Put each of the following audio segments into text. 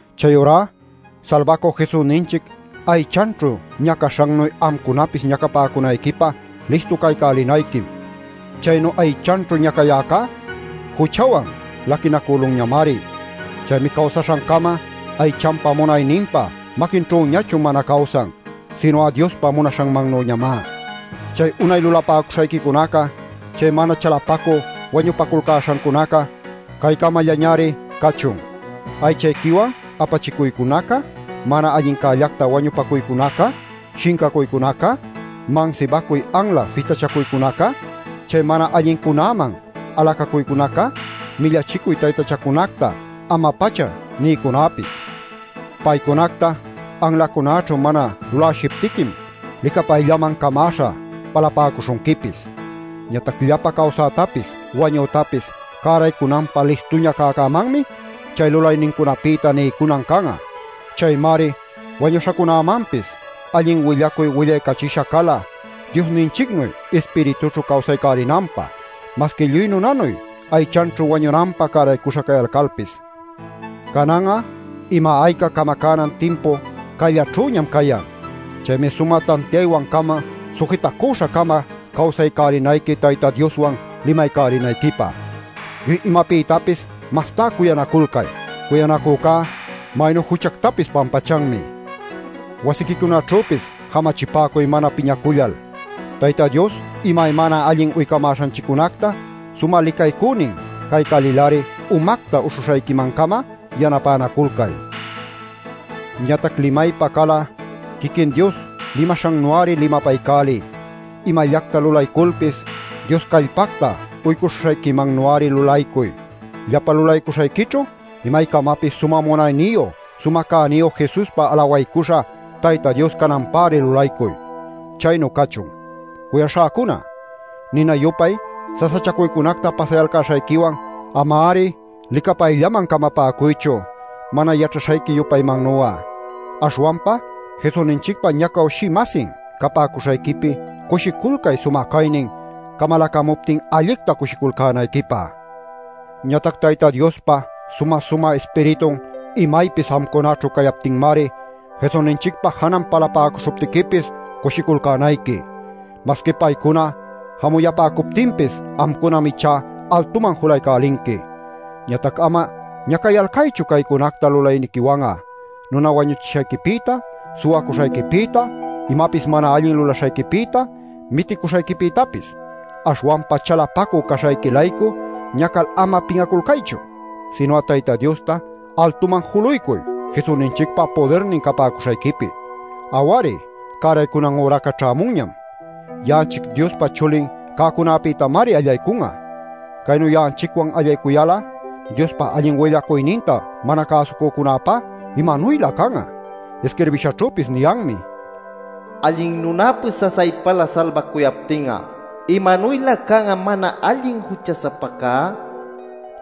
Chayurá Salbacü Jesusninchic aychanćhu ñacaśhannuy amcunapis ñacapäcunayquipä listu caycälinayquim. Chaynu aychanćhu ñacayäcá juchawan laquinacülunñamari. Chaymi cawsaśhancama aychanpa munayninpa maquinćhüñachu mana cawsan, sinu'a Diospa munaśhanmannüñamá. Chay unay lulapäcuśhayquicunaca chay mana chalapacü wañupaculcäśhancunaca caycamallañari cachun: aychayquiwan apachicuycunaca, mana allincällacta wañupacuycunaca, shincacuycunaca, mansibacuy anla fistachacuycunaca, chay mana allincunäman alacacuycunaca, millachicuy taytachacunacta ama-pacha niycunäpis. Paycunacta anlacunäćhu mana lulawshiptiquim licapayllaman camäśha palapäcuśhunquipis. Ñatac llapa cawsätapis wañütapis cäraycunanpä listuña cäcämanmi chay lulaynincunapïta niycunan can'a. Chaymari wañuśhacunämanpis allin willacuy willaycachisha cala Diosninchicnuy ispiritućhu cawsaycälinanpä, masqui lluy nunanuy aychanćhu wañunanpä cäraycuśha cayalcalpis. Canan'a ima-ayca camacänan timpuca cayllaćhüñam cayan. Chaymi sumä tantiaywan-cama sujitacüśha-cama cawsaycälinayqui Tayta Dioswan limaycälinayquipä. Lluy imapïtapis mastá cuyanaculcay. Cuyanacücá maynu juchactapis pampachanmi. Wasiquicunaćhüpis jamachipäcuy mana piñacullal. Tayta Dios imaymana allin uycamäśhanchiccunacta sumä licaycünin caycälil-ari umacta uśhuśhayquiman-cama yanapänaculcay. Ñatac limaypä cal'a quiquin Dios limaśhannu-ari limapaycäliy. Imallacta lulayculpis Dios callpacta uycuśhuśhayquimannu-ari lulaycuy. Llapa lulaycuśhayquićhu imaycamapis sumä munayniyu sumä cayniyu Jesuspa alawaycuśha Tayta Dios cananpäri lulaycuy. Chaynu cachun. Cuyaśhäcuna, nina-yupay sasachacuycunacta pasayalcäśhayquiwan ama-ari licapayllaman camapäcuychu mana yaćhaśhayqui-yupaymannu'a. Aśhwanpa Jesusninchicpa ñacawshï-masin capäcuśhayquipi cushiculcay sumä caynin camalacamuptin allicta cushiculcänayquipä. Ñatac Tayta Diospa sumä-sumä Ispiritun imaypis amcunaćhu cayaptinmari Jesusninchicpa janan palapäcuśhuptiquipis cushiculcänayqui. ˻Masqui paycuna jamuyapäcuptinpis amcunam ichá altuman julaycälinqui.˼ Ñatac ama ñacayalcaychu caycunacta lulayniquiwan'a: nuna wañuchishayquipïta, suwacuśhayquipïta, imapis mana allin lulaśhayquipïta, miticuśhayquipïtapis. Aśhwanpa chalapacü caśhayqui-laycu ñacal ama pin'aculcaychu. Sinu'a Tayta Diosta altuman juluycuy Jesusninchicpa pudirnin capäcuśhayquipi. Aw-ari, cäraycunan üraca ćhämunñam. Ya'anchic Diospa chulin cäcunapïtamari allaycun'a. Caynu ya'anchicwan allaycuyal'a Diospa allin willacuyninta mana cäsucücunäpá ¿imanuylä can'a? Isquirbishanćhüpis niyanmi: “Allin nunäpis sasaypalä salbacuyaptin'a ¿imanuylä can'a mana allin jucha-sapacá?” nil.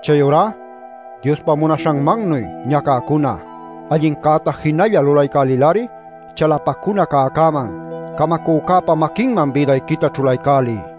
Chayurá Diospa munaśhanmannuy ñacäcuna, allincäta jinalla lulaycälil-ari Chalapacuna Cäcäman, Camacücäpa maquinman bïdayquita ćhulaycäliy.